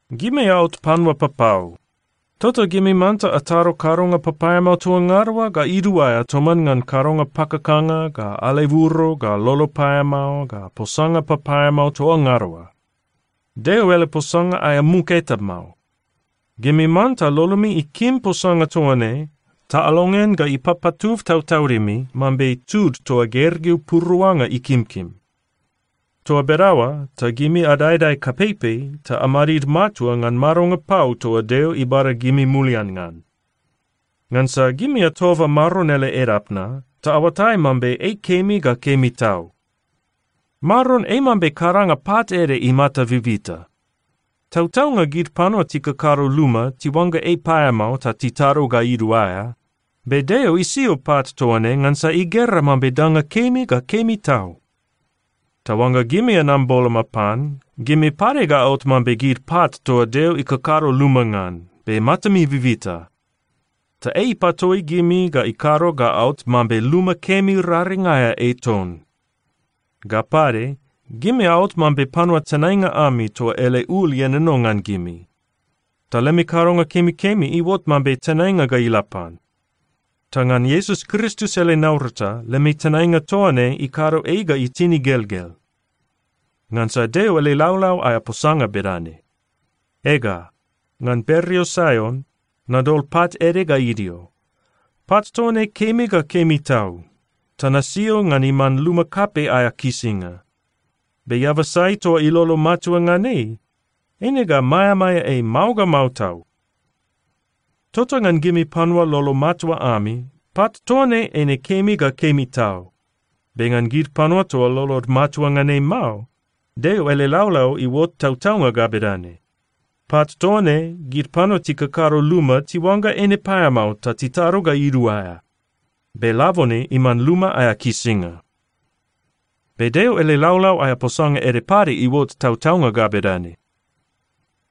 Gimi aot panua papau, tota gimi manta atado kadonga papaeamao toa ngada oa ga iduaea toman ngan kadonga pakakanga, ga aleburo, ga lolo paeamao, ga posanga papaeamao toa ngada oa. Deo ele posanga aea muk eta mao. Gimi manta lolomi ikim posanga toa ne ta alongean ga ipapatub tautaudimi mambe tud toa gergeu puruanga ikimkim. Toa bedaoa ta gimi adaedae kapeipei ta amadid matua ngan madonga pau toa Deo ibada gimi mulian ngan. Ngansa gimi atoba Maron ele edap na, ta aoatai mambe ei kemi ga kemi tau. Maron ei mambe kadanga pat ede imata bibita. Tautaunga gid panua tikakado luma tiuangga ei paeamao ta titado ga iduaea. Be Deo isio pat toa ne ngansa igera mambe danga kemi ga kemi tau. Ta oangga gimi anam boloma pan, gimi pade ga aot mambe gid pat toa Deo ikakado luma ngan, be matami bibita. Ta ei ipatoi gimi ta ikado ga aot mambe luma kemi raring aea ei ton. Ga pade, gimi aot mambe panua tenainga ami toa ele ul ienono ngan gimi. Ta lemi kadonga kemikemi iuot mambe tenainga ga ila pan, ta ngan Iesus Kristus ele naurata, lemi tenainga toa ne ikado ei ga itin igelgel. Ngansa Deo ele laulau aea posanga bedane, “Ega, ngan bereo Saion nadol pat ede ga idio. Pat toa ne kemi ga kemi tau, ta nasio ngan iman luma kapei aea kisinga. Be eaba sai toa ilolo matua ngan ei, eine ga maeamaea ei mao ga mao tau.” Tota ngan gimi panua lolo matua ami, pat toa ne eine kemi ga kemi tau. Be ngan gid panua toa lolod matua ngan ei mao, Deo ele laulau iuot tautaunga ga bedane, “Pat toa ne, gid panua tikakado luma tiuangga eine paeamao ta titado ga iduaea. Be labone iman luma aea kisinga.” Be Deo ele laulau aea posanga ede pade iuot tautaunga ga bedane,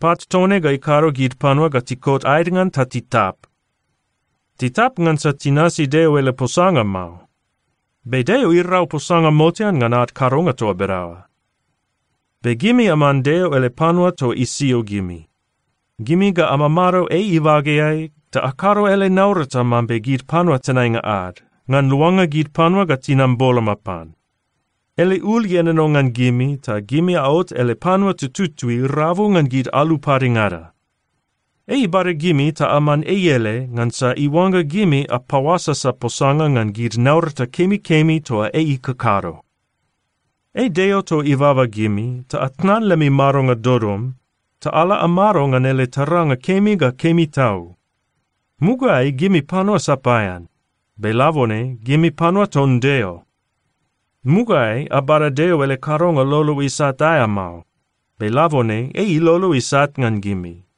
“Pat toa ne ga ikado gid panua ga tikot aed ngan ta titap.” Titap ngansa tinasi Deo ele posanga mao. Be Deo irau posanga motean ngan ad kadonga toa bedaoa. Be gimi aman Deo ele panua toa isio gimi. Gimi ga amamado ei ibageai ta akado ele naurata mambe gid panua tenainga ad, ngan luanga gid panua ga tinam boloma pan. Ele ul ienono ngan gimi, ta gimi aot ele panua tututui rabu ngan gid alu padengada. Ei ibada gimi ta aman ei ele, ngansa iuangga gimi apaoasasa posanga ngan gid naurata kemikemi toa ei ikakado. Ei Deo toa ibaba gimi ta atnan lemi madonga dodom ta ala amado ngan ele taranga kemi ga kemi tau. Mugaeai gimi panua sapaean. Be labone gimi panua ton Deo. Mugaeai abada Deo ele kadonga lolo isat aea mao. Be labone ei ilolo isat ngan gimi.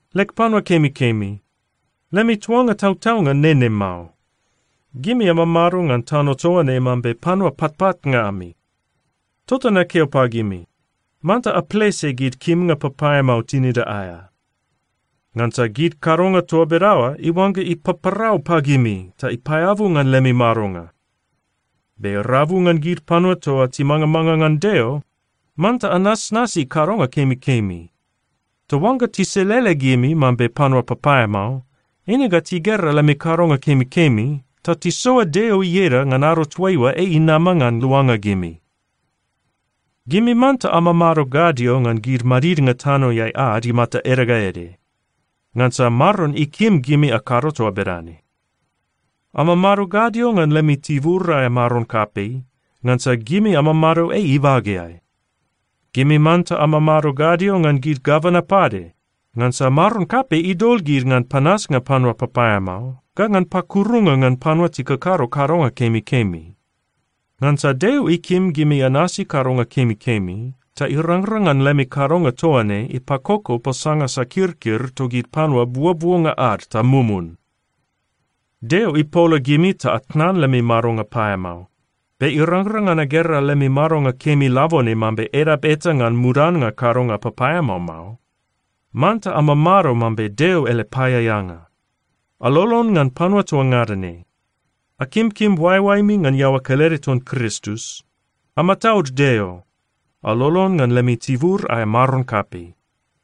Leg panua kemikemi, lemi tuanga tautaunga nene mao. Gimi amamado ngan tano toa ne mambe panua patpatnga ami. Tota nakeo pagimi, manta aplese gid kimnga papaeamao tinida aea. Ngansa gid kadonga toa bedaoa iuangga ipaparau pagimi ta ipaeabu ngan lemi madonga. Be rabu ngan gid panua toa timangamanga ngan Deo, manta anasnasi kadonga kemikemi. Ta oangga tiselele gimi mambe panua papaeamao, eine ga tigera lemi kadonga kemikemi ta tisoa Deo ieda ngan ado toaiua ei inama ngan luanga gimi. Gimi manta amamado gadio ngan gid madidnga tanoeai ad imata ede ga ede, ngansa Maron ikim gimi akado toa bedane. Amamado gadio ngan lemi tibur aea maron kapei, ngansa gimi amamado ei ibageai. Gimi manta amamado gadio ngan gid gavana pade, ngansa maron kapei idol gid ngan panasnga panua papaeamao, ga ngan pakurunga ngan panua tikakado kadonga kemikemi. Ngansa Deo ikim gimi anasi kadonga kemikemi ta irangrang ngan lemi kadonga toa ne ipakoko posanga sakirkir togid panua buobuonga ad ta mumun. Deo ipola gimi ta atnan lemi madonga paeamao. Be irangrang ngan agera lemi madonga kemi labone mambe edap eta ngan mudannga kadonga papaeamao mao. Manta amamado mambe Deo ele paeaeanga. Alolon ngan panua toa ngada ne. Akimkim oaeoaemi ngan iaoa kelede ton Kristus. Amataud Deo. Alolon ngan lemi tibur aea maron kapei.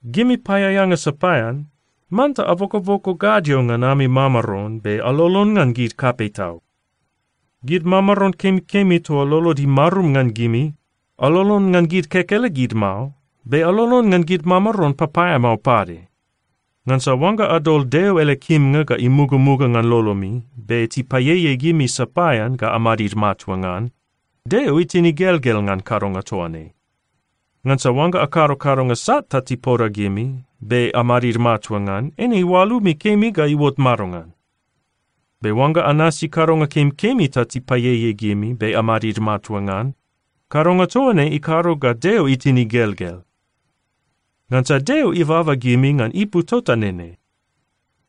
Gimi paeaeanga sapaean, manta abokoboko gadio ngan ami mamaron be alolon ngan gid kapei tau. Gid mamaron kemikemi toa lolod imarum ngan gimi, alolon ngan gid kekelegid mao, be alolon ngan gid mamaron papaeamao pade. Ngansa oangga adol Deo ele kimnga ga imugamuga ngan lolomi, be tipaieiei gimi sapaean ga amadid matua ngan, Deo itin igelgel ngan kadonga toa ne. Ngansa oangga akado kadonga sat ta tipoda gimi, be amadid matua ngan, eine oalumi kemi ga iuot madongan? Be oangga anasi kadonga kemikemi ta tipaieiei gimi be amadid matua ngan, kadonga toa ne ikado ga Deo itin igelgel. Ngansa Deo ibaba gimi ngan ipu tota nene.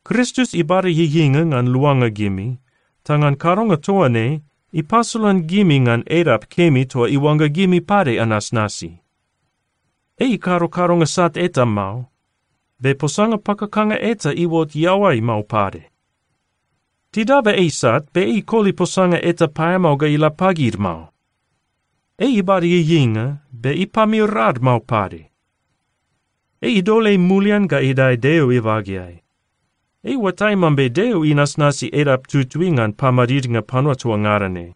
Kristus ibada ieieinga ngan luanga gimi, ta ngan kadonga toa ne, ipasolan gimi ngan edap kemi toa iuangga gimi pade anasnasi. “Ei ikado kadonga sat eta mao. Be posanga pakakanga eta iuot iaoai mao pade.” Tidaba ei sat, be ei ikoli posanga eta paeamao ga ila pagid mao. Ei ibada ieieinga, be ipamir ad mao pade. Ei idol ei mulian ga idae Deo ibageai. Ei iuatai mambe Deo inasnasi edap tutui ngan pamadidnga panua toa ngada ne.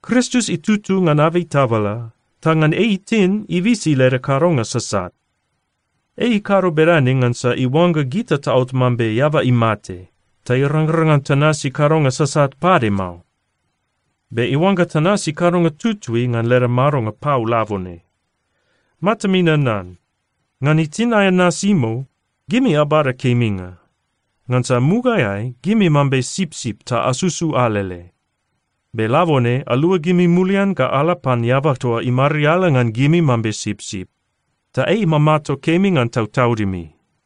Kristus itutu ngan abei tabala, ta ngan ei itin, ibisi leda kadonga sasat. Ei ikado bedane ngansa iuangga gita taot mambe eaba imate, ta irangrang ngan tanasi kadonga sasat pade mao. Be iuangga tanasi kadonga tutui ngan leda madonga pau labone. Matami nanan. Ngan itin aea nasimou, gimi abada keminga. Ngansa mugaeai gimi mambe sipsip ta asusu alele, be labone aluagimi mulian ga ala pan eaba toa imariala ngan gimi mambe sipsip, ta ei imamato kemi ngan tautaudimi.